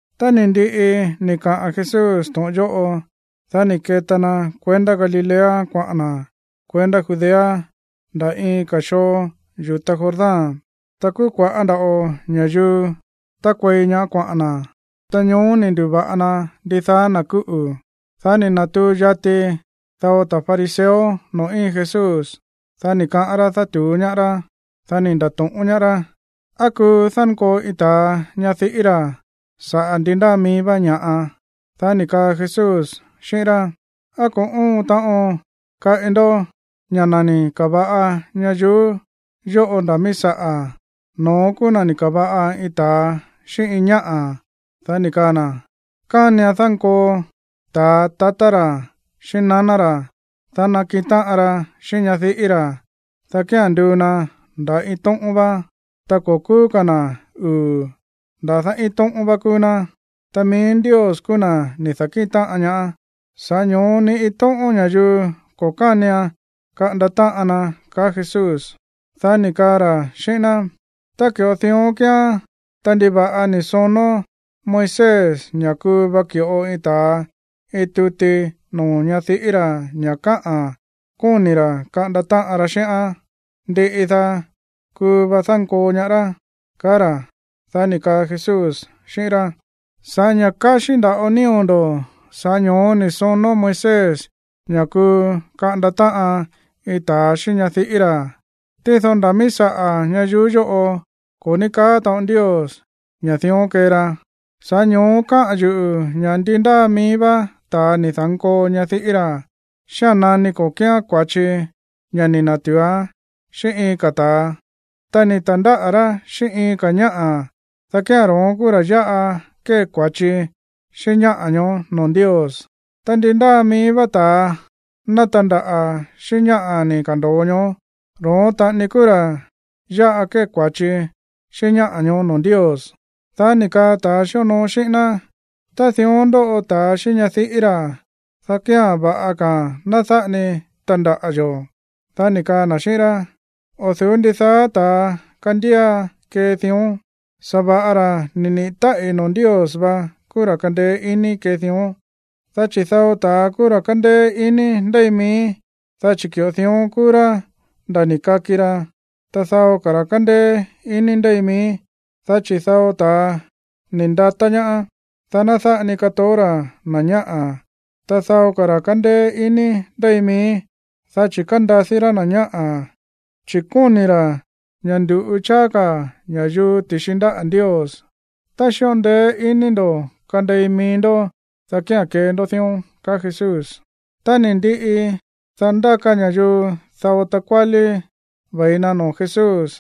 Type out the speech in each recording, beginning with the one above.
Tá ni̱ ndiꞌi ni̱ kaꞌa̱n Jesús to̱ꞌon yóꞌo, dá ni̱ keta na kuendá Galilea kuaꞌa̱n na̱ kuendá Judea nda̱ iin ka̱ xoo yu̱ta Jordán. Ta kúú kua̱ꞌá nda̱ꞌo ña̱yuu tákuei ñaá kuaꞌa̱n na̱, ta ñoó ni̱ ndu̱va̱ꞌa na ndidaá na̱ kúꞌu̱. Dá ni̱ na̱tuu yati dao ta̱ fariseo noo̱ íin Jesús, dá ni̱ kaꞌán rá dátu̱ú ñaá rá, dá ni̱ nda̱to̱ꞌón ñaá rá: ―¿Á kuu dánkoo iin ta̱a ñadiꞌí ra̱ saꞌa̱ ndi ndáa mií vá ña̱ꞌa? Dá ni̱ kaa Jesús xíꞌín rá: ―¿Á ko̱ óon taꞌon kaꞌi ndó ña̱ na̱ ni̱ ka̱va̱ꞌa ñayuú yóꞌo nda̱ míí saꞌa̱, “no̱ón kúú na̱ ni̱ ka̱va̱ꞌa iin ta̱a xíꞌín iin ñáꞌa̱”? Dá ni̱ kaa na̱: “Kánian dánkoo ta̱a tatá ra̱ xíꞌín naná ra̱, dá nakiꞌin táꞌan ra xíꞌín ñadiꞌí ra̱, dá kía̱n nduu na nda̱ iin tóꞌón vá.” Ta ko̱ kúú ka̱ na̱ uu̱, nda̱dá iin tóꞌón vá kúú ná. Ta mií Ndios kúú na̱ ni̱ da̱kíꞌin táꞌan ñaá, sa̱ꞌá ño̱ó ni iin tóꞌón ña̱yuu ko̱ kánian kaꞌanda táꞌan na ―ka̱á Jesús. Dá ni̱ kaa ra̱ xíꞌín ná: ―Tá ki̱ꞌo dión kíán, ta ¿ndiva̱ꞌa ni̱ sonó Moisés ña̱ kuu va ki̱ꞌo iin ta̱a iin tuti noo̱ ñadiꞌí ra̱ ña̱ káꞌa̱n ña̱ kóni̱ ra̱ kaꞌanda táꞌan ra xíꞌán, ndiꞌi daá, dá kuu va dánkoo ñaá rá? ―kaá ra̱. Dá ni̱ kaa Jesús xíꞌín rá: ―Sa̱ꞌá ña̱ káxí nda̱ꞌo nío̱ ndo̱, sa̱ꞌá ño̱ó ni̱ sonó Moisés ña̱ kuu kaꞌanda táꞌan iin ta̱a xíꞌín ñadiꞌí ra̱. Tído nda̱ míí saꞌa̱ ñayuú yóꞌo ko̱ ní kaá taꞌon Ndios ña̱ dión kee ra. Sa̱ꞌá ño̱ó káꞌa̱n yuꞌu̱ ña̱ ndi ndáa mií vá ta̱a ni̱ da̱nkoo ñadiꞌí ra̱, xía̱n nani ko̱ kíán kua̱chi ña̱ ni̱ na̱tu̱uán xíꞌín iin ka̱ ta̱a, ta ni̱ ta̱ndáꞌa̱ rá xíꞌín iin ka̱ ñáꞌa̱, dá kía̱n ro̱ón kúú ra̱ yáꞌa kée kua̱chi xíꞌín ñáꞌa̱ ñoó noo̱ Ndios. Ta ndi ndáa mií vá ta̱a ná tandaꞌa̱ xíꞌín ñáꞌa̱ ni̱ ka̱ndo̱o ñoó, ro̱ón taꞌani kúú ra̱ yáꞌa kée kua̱chi xíꞌín ñáꞌa̱ ñoó noo̱ Ndios. Dá ni̱ kaa ta̱a xíonoo xíꞌín ná: ―Tá dión ndóꞌo ta̱a xíꞌín ñadiꞌí ra̱, dá kía̱n va̱ꞌa ka̱a̱n ná dáꞌa ni tandaꞌa̱ yo̱. Dá ni̱ kaa na̱ xíꞌín rá: ―O̱ du̱ú ndidaá ta̱a kándía kee dión, sa̱va̱ꞌa ra̱ ni̱ niꞌi̱ táꞌi̱ noo̱ Ndios vá kúú ra̱ kandeé iní kee dión. Dá chi̱ dao ta̱a kúú ra̱ kándéé iní ndéi mií, dá chi̱ ki̱ꞌo dión kúú rá nda̱ ni̱ kaki ra. Ta dao ka̱ ra̱ kándéé iní ndéi mií, dá chi̱ dao ta̱a ni̱ ndata̱ ñaá, dá ná dáꞌa ni katoó ra̱ na̱ ñáꞌa̱. Ta dao ka̱ ra̱ kándéé iní ndéi mií, dá chi̱ kándadí ra̱ na̱ ñáꞌa̱, chi̱ kóni̱ ra̱ ña̱ ndu̱ꞌu cháá ka̱ ña̱yuu ti̱xi ndáꞌa̱ Ndios. Tá xíꞌo ndeé iní ndo̱ kandei mií ndó, dá kía̱n kee ndó dión ―kaá Jesús. Ta ni̱ ndiꞌi, dá ndáka ña̱yuu dao takuálí ve̱i na noo̱ Jesús,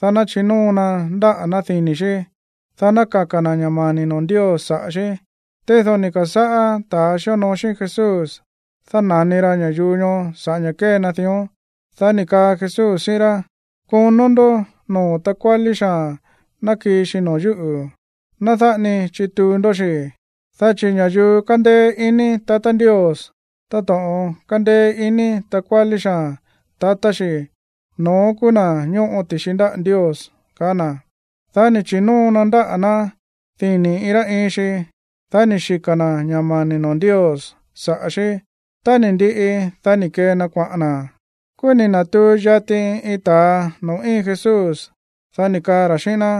dá ná chinóo na ndáꞌa̱ ná dini̱ xí, dá ná kaka̱ na̱ ña̱ mani̱ noo̱ Ndios saꞌa̱ xí. Tído ni̱ ka̱sáꞌá ta̱a xíonoo xíꞌín Jesús dána̱ni ra ña̱yuu ñoó sa̱ꞌá ña̱ kée na dión. Dá ni̱ kaa Jesús xíꞌín rá: ―Konó ndó noo̱ takuálí xaa̱n ná kii xi noo̱ yúꞌu̱. Ná dáꞌa ni chituu ndó xi̱, dá chi̱ ña̱yuu kándéé iní tatá Ndios táto̱ꞌon kándéé iní takuálí xaa̱n tatá xi̱, no̱ón kúú na̱ ñóꞌo ti̱xi ndáꞌa̱ Ndios ―kaá na̱. Dá ni̱ chi̱nóo na ndáꞌa̱ ná dini̱ iin rá iin xi. Dá ni̱ xika̱ na̱ ña̱ mani̱ noo̱ Ndios saꞌa̱ xí. Tá ni̱ ndiꞌi, dá ni̱ kee na kuaꞌa̱n na̱. Kúú ni̱ na̱tuu yati iin ta̱a noo̱ íin Jesús, dá ni̱ kaa ra̱ xíꞌín ná: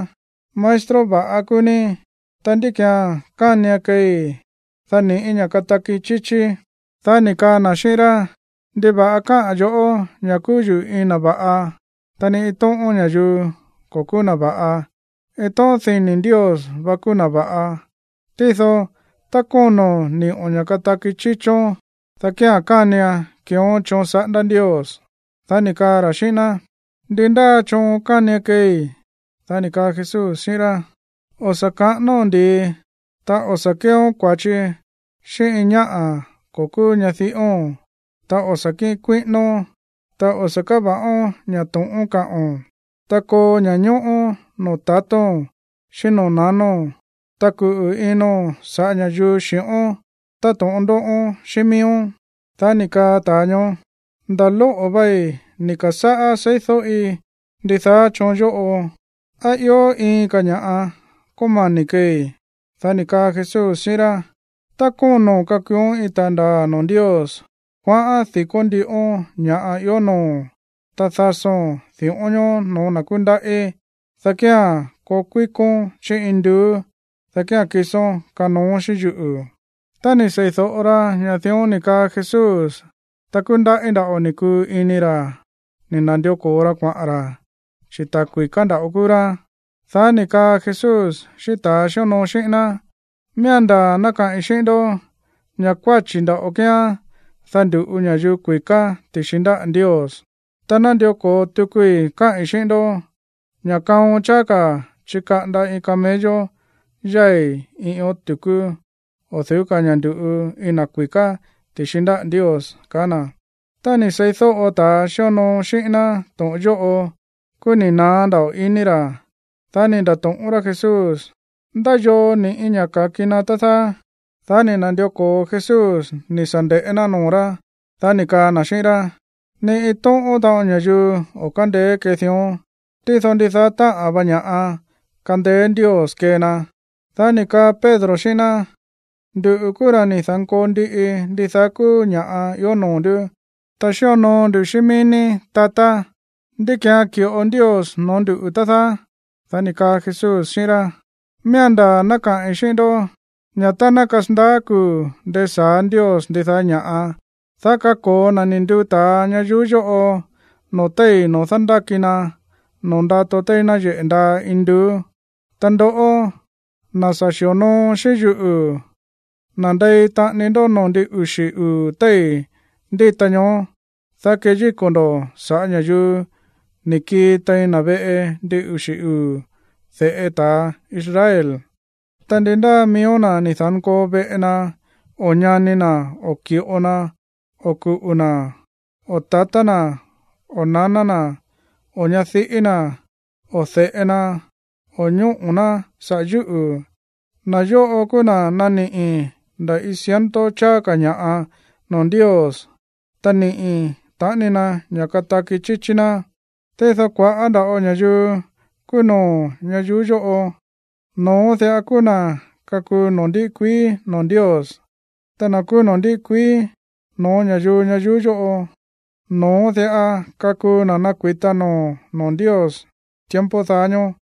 ―Maestro va̱ꞌa kúú ní. Ta, ¿ndí ki̱án kánian keei, dá ni̱ꞌí ña̱ kataki chíchíí? Dá ni̱ kaa na̱ xíꞌín rá: ―¿Ndiva̱ꞌa káꞌa̱n yo̱ꞌó ña̱ kúú yuꞌu̱ iin na̱ va̱ꞌa? Ta ni iin tóꞌón ña̱yuu ko̱ kúú na̱ va̱ꞌa. Iin tóꞌón dini̱ Ndios vá kúú na̱ va̱ꞌa. Tído, tá kóno̱n ni̱ꞌo̱n ña̱ kataki chíchón, dá kía̱n kánian keeón choon saꞌándá Ndios. Dá ni̱ kaa ra̱ xíꞌín ná: ―¿Ndi ndáa choon kánian keei? Dá ni̱ kaa Jesús xíꞌín rá: ―O̱ sa̱ kaꞌánóo̱n ndi̱i, ta o̱ sa̱ kéeón kua̱chi xíꞌín iin ñáꞌa̱ ko̱ kúú ñadiꞌóo̱n, ta o̱ sa̱ kíꞌin kuíꞌínón, ta o̱ sa̱ káva̱ꞌón ña̱ to̱ꞌón kaꞌo̱n, ta koo ña̱ñóꞌó noo̱ tatóo̱n xíꞌín noo̱ nanóo̱n, ta kuꞌu̱ ino̱n sa̱ꞌá ña̱yuu xi̱ꞌón táto̱ꞌon ndóꞌón xíꞌín miíón. Dá ni̱ kaa ta̱a ñoó: ―Nda̱ lóꞌo̱ vei ni̱ ka̱sáꞌá seídóꞌi ndidaá choon yóꞌo. ¿Á ió iin ka̱ ña̱ꞌa kómani̱ keei? Dá ni̱ kaa Jesús xíꞌín rá: ―Tá kóno̱n kakuuón iin ta̱a ndaa̱ noo̱ Ndios, kuaꞌán di̱kó ndíꞌón ña̱ꞌa ió noo̱o̱n, ta dasóo̱n di̱ꞌón ñoó no̱ó na̱ kúndaꞌí, dá kía̱n koo kuíkón chí induú, dá kía̱n kisón kanooón xíꞌín yuꞌu̱. Tá ni̱ sei̱do̱ꞌo ra ña̱ dión ni̱ kaa Jesús, ta kúndaꞌí nda̱ꞌo ni̱ kuu ini ra̱ ni̱ na̱ndió ko̱o ra kuaꞌa̱n ra̱, chi̱ ta̱ kui̱ká nda̱ꞌo kúú rá. Dá ni̱ kaa Jesús xíꞌín ta̱a xíonoo xíꞌín ná: ―Miía̱n ndaa̱ ná kaꞌi̱n xíꞌín ndó ña̱ kuáchi̱ nda̱ꞌo kíán, dá ndu̱ꞌu ña̱yuu kui̱ká ti̱xi ndáꞌa̱ Ndios. Ta nándió ko̱o tukui káꞌi̱n xíꞌín ndó ña̱ kaon cháá ka̱ chikaꞌanda iin camello yái̱ iin ión tu̱kú o̱ du̱ú ka̱ ña̱ ndu̱ꞌu iin na̱ kui̱ká ti̱xi ndáꞌa̱ Ndios ―kaá na̱. Tá ni̱ seídóꞌo ta̱ xíonoo xíꞌín ná to̱ꞌon yóꞌo, kúú ni̱ naá nda̱ꞌo ini ra̱. Dá ni̱ nda̱to̱ꞌón rá Jesús: ―¿Ndá yoo ni̱ꞌí ña̱ ka̱ki na, tá dáá? Dá ni̱ na̱ndió ko̱o Jesús ni̱ sa̱ nde̱ꞌé ná noo̱ rá, dá ni̱ kaa na̱ xíꞌín rá: ―Ni iin tóꞌón taꞌon ña̱yuu o̱ kándeé kee dión, tído ndidaá táꞌa̱n va ña̱ꞌa kándéé Ndios kee na. Dá ni̱ kaa Pedro xíꞌín ná: ―Nduꞌu̱ kúú ra̱ ni̱ da̱nkoo ndiꞌi ndidaá kúú ña̱ꞌa ió noo̱ ndú, ta xíonoo ndu xíꞌín mií ní, tatá. ¿Ndí ki̱án ki̱ꞌo Ndios noo̱ ndúꞌu̱, tá dáá? Dá ni̱ kaa Jesús xíꞌín rá: ―Miía̱n ndaa̱ ná kaꞌi̱n xíꞌín ndó ña̱ tá ná kasandaá kuu̱ ndesa̱á Ndios ndidaá ña̱ꞌa, dá kako̱o na̱ ni̱ nduu ta̱a ñayuú yóꞌo noo̱ téi̱ noo̱ dándáki na noo̱ ndato téí náyeꞌe̱ ndaa induú. Ta ndoꞌó, na̱ sa̱ xi̱onoo xíꞌín yuꞌu̱, nandei taꞌani ndó noo̱ ndin uxi̱ uu̱ téi̱ ndíta ñoó, dá keyíko̱ ndo̱ sa̱ꞌá ña̱yuu ni̱ kii tein na̱ veꞌe ndin uxi̱ uu̱ de̱ꞌe ta̱ Israel. Ta ndi ndáa miíó na̱ ni̱ da̱nkoo veꞌe na, o ñani na̱, o ki̱ꞌo na, o kuꞌu̱ na̱, o tatá na̱ o naná na̱, o ñadiꞌí na̱, o de̱ꞌe na o ñóꞌo̱ ná saꞌa̱ yúꞌu̱, na̱ yóꞌo kúú na̱ naniꞌi̱ nda̱ iin ciento cháá ka̱ ña̱ꞌa noo̱ Ndios, ta niꞌi̱ taꞌani na ña̱ kataki chíchí ná. Tído kua̱ꞌá nda̱ꞌo ña̱yuu kúú no̱ó ñayuú yóꞌo, no̱ón diꞌa kúú na̱ kakuu noo̱ ndiꞌi kuií noo̱ Ndios. Ta na̱ kúú noo̱ ndíꞌi kuií no̱ó ña̱yuu ñayuú yóꞌo, no̱ón diꞌa kakuu na̱ kuita noo̱ noo̱ Ndios tiempo daá ñóó.